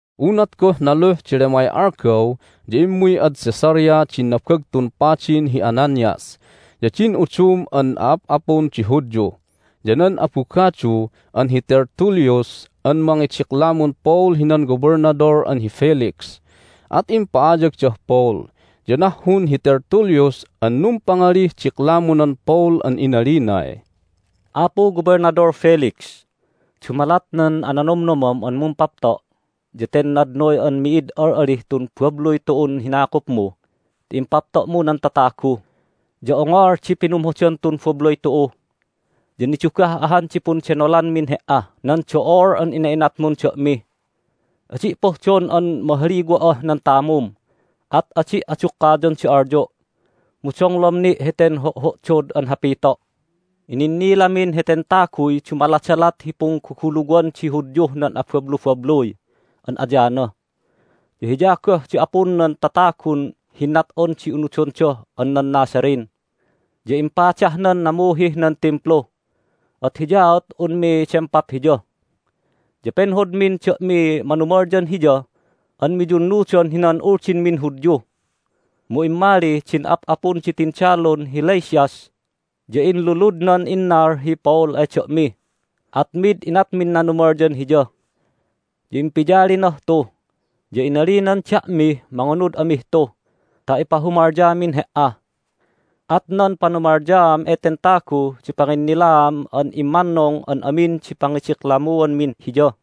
Unat goh naluh di lemay algaw ya immuy ad Caesarea din Nabagtun Padin hi Ananias, ya din udum an a'ap'apun di Hudyu, ya nan abugadu an hi Tertullus an mangidiklamun Paul hinan Gobelnadol an hi Felix. At impa'ayagdah Paul. Ya nahhun hi Tertullus an numpangalih diklamunan Paul an inalinay, "Apu Gobelnadol Felix, dumalat nan ananomnomam an mumpapto' ya ten nadnoy an mi'id al'alih tun babluy tu'un hinakupmu ti impapto'mu nan tatagu, ya ongol di pinumhodan tun babluy tu'u. Ya nidugah ahan di pundenolanmin he"ah nan do'ol an ina'inatmun da'mi. Adi' pohdon an mahaliwa'ah nan tamum, at adi' adukkayon di alyo', mu donglom ni' heten ho'ho'dod an hapito'. Ininnilamin heten taguy dumaladalat hi pungguguluwan di Hudyuh nan abablubabluy an ayana, ya hiya goh di apun nan tatagun hinnat'on di unudonda an nan Nazarene. Ya impadahnan namuhih nan Timplu, at hiyaat unmi dempap hiya. Ya penhodmin da'miy manumalyan hiya an miyunnudan hinan Uldinmin Hudyu. Mu immali din ap'apun di tindalun hi Lysias, ya inluludnan innal hi Paul ay da'mi, at mid inatmin nanumalyan hiya. Ya impiyalinah tu, ya inalinan da'mih mangunud amih tu ta ipahumalyamin he"a. At nan panumalyaam eten tagu di panginnilaam an immannung an amin di pangidiklamuanmin hiya."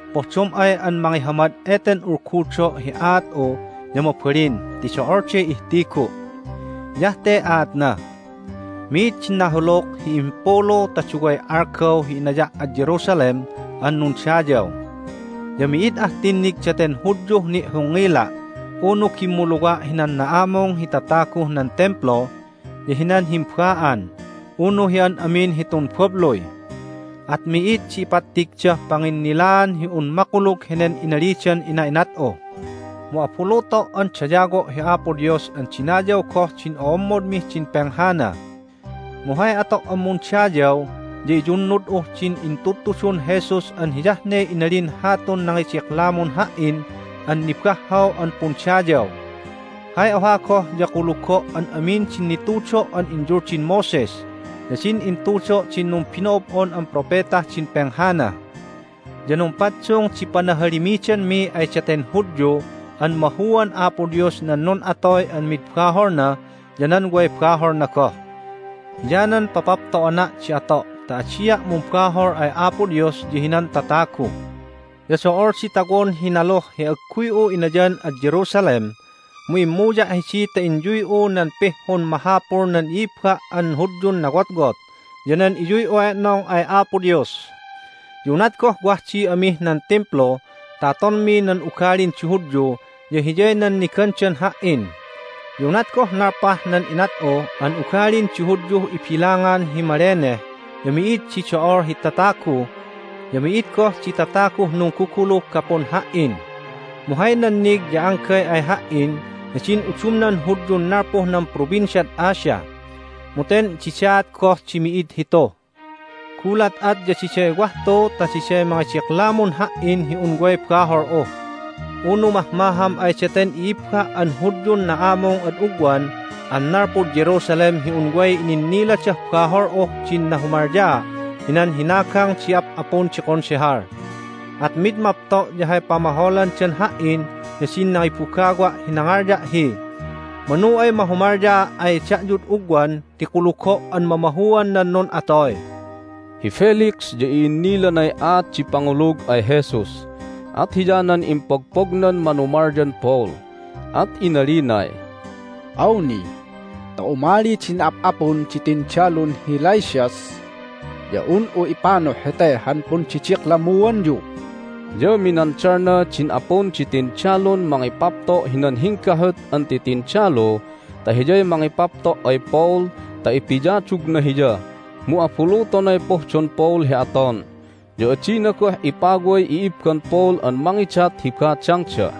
Pohdom ay an mangihamad eten ulgudo' hi aat'u ya mabalin ti do'olday ihtigu'. Hiyah te aatna: Mi'id di nahuluk hi himpulu ta duway algaw hi inaya' ad Jerusalem an nundayaw. Ya mi'id ah tinnig daten Hudyuh ni'hongngila' unu gimmuluwa' hinan na'amung hi tataguh nan Timplu, ya hinan himba'an, unu hi an amin hitun babluy. At mi'id di ipattigdah panginnilaan hi un makulug henen inalidan ina'inat'u. Mu abuluto' an dayawo' hi Apo Dios an dinayaw goh din o'ommodmih din penghana. Mu hay ato' an mundayaw ya iyunnud'uh din intudtudun Jesus an hiyah ne inalin hatun nangidiklamun ha"in an nibahhaw an pundayaw. Hay oha goh ya kulugo' an amin din nitudo' an inyuldin Moses ya din intudo' din numbino'ob'on an propetah din penghana. Ya numpaddung di panahalimidanmi ay daten Hudyu an mahuan Apo Dios nan nun'atoy an mid baholna ya nan way baholna goh. Hiyanan papapto'ana' di ato' ta adia' mumbahol ay Apo Dios ya hinan tatagu. Ya do'ol di tawon hi naluh hi agguy'u inayan ad Jerusalem, mu immuya' hidi ta inyuy'u nan pihhun mahapul nan i'ibba' an Hudyun nawotwot ya nan iyuy'u e'nong ay Apo Dios. Ya unat goh wah di amih nan Timplu ta atonmi nan ugalin di Hudyu ya hiyay nannigandan ha"in. Ya unat goh nalpah nan inat'u an ugalin di Hudyuh ibilangan hi maleneh ya mi'id di do'ol hi tatagu, ya mi'id goh di tataguh nungguguluh gapun ha"in. Mu hay nannig ya anggay ay ha"in ya din udumnan Hudyun nalpuh nan Provinciad Asia, mu ten didaat goh di mi'id hitu. Gulat at, ya diday wah tu ta diday mangidiklamun ha"in hi un way bahol'u. Unu mahmaham ay daten i'ibba an Hudyun na'amung ad ugwan an nalpud Jerusalem hi un way ininniladah bahol'uh din nahumalyaa' hinan hinagang di ap'apun di Konsehal. At mid mapto' ya hay pamaholandan ha"in ya din nangibugawa' hi nangalya' hi, Manu ay mahumalyaa' ay da'yud ugwan ti kulugo' an mamahuan nan nun'atoy." Hi Felix ya i'innilanay aat di pangulug ay Jesus, at hiyanan impogpognan manumalyan Paul, at inalinay, "Awni ta umali din ap'apun di tindalun hi Lysias ya un'u ipanuh hete han pundidiklammuanyu." Ya minandalna din apun di tindalun mangipapto' hinan hinggahut an titindalu ta hiyay mangipapto' ay Paul ta ipiyadugna hiya, mu abulutonay pohdon Paul hi aton, ya adina goh ipaway i'ibban Paul an mangidat hi badangda.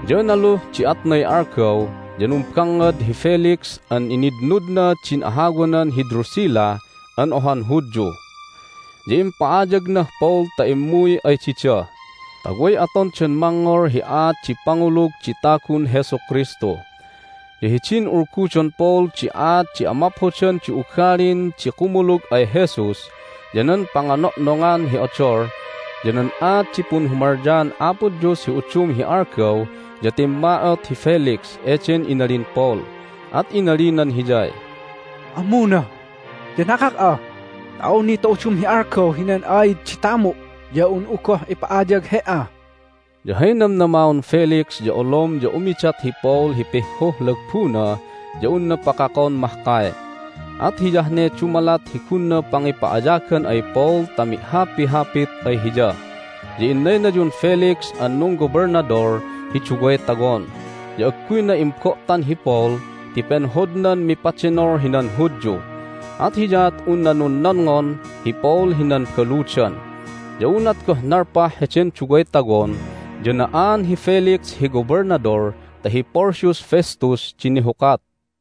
Ya naluh di atnay algaw ya numbangngad hi Felix an initnudna din ahawanan hi Drusilla an ohan Hudyu. Ya impa'ayagnah Paul ta immuy ay dida, ta way atondan mangngol hi aat di pangulug di tagun Jesu Kristu. Ya hidin ulgudon Paul di aat di amaphodan di ugalin di kumulug ay Jesus, ya nan pangano'nongan hi odol, ya nan aat di punhumalyaan Apo Dios hi udum hi algaw ya timma'ot hi Felix eden inalin Paul, at inalinan hiyay, "Ammuna! Ya nakak'a! Ta awni ta udum di algaw hinan aid di tamu' ya un'u goh ipa'ayag he"a!" Ya hay namnamaon Felix ya olom ya umidat hi Paul hi pihhuh lagbuna ya unna pakakon mahkay. At hiyah ne dumalat hi gunna pangipa'ayagan ay Paul ta mi'hapihapit ay hiya. Ya innaynayun Felix an nunggobelnadol hi duway tawon, ya agguyna imbo'tan hi Paul ti penhodnan mipadenol hinan Hudyu, at hiyaat unna nunnonngon hi Paul hinan baludan. Ya unat goh nalpah heden duway tawon ya na'aan hi Felix hi gobelnadol ta hi Porcius Festus di nihukat.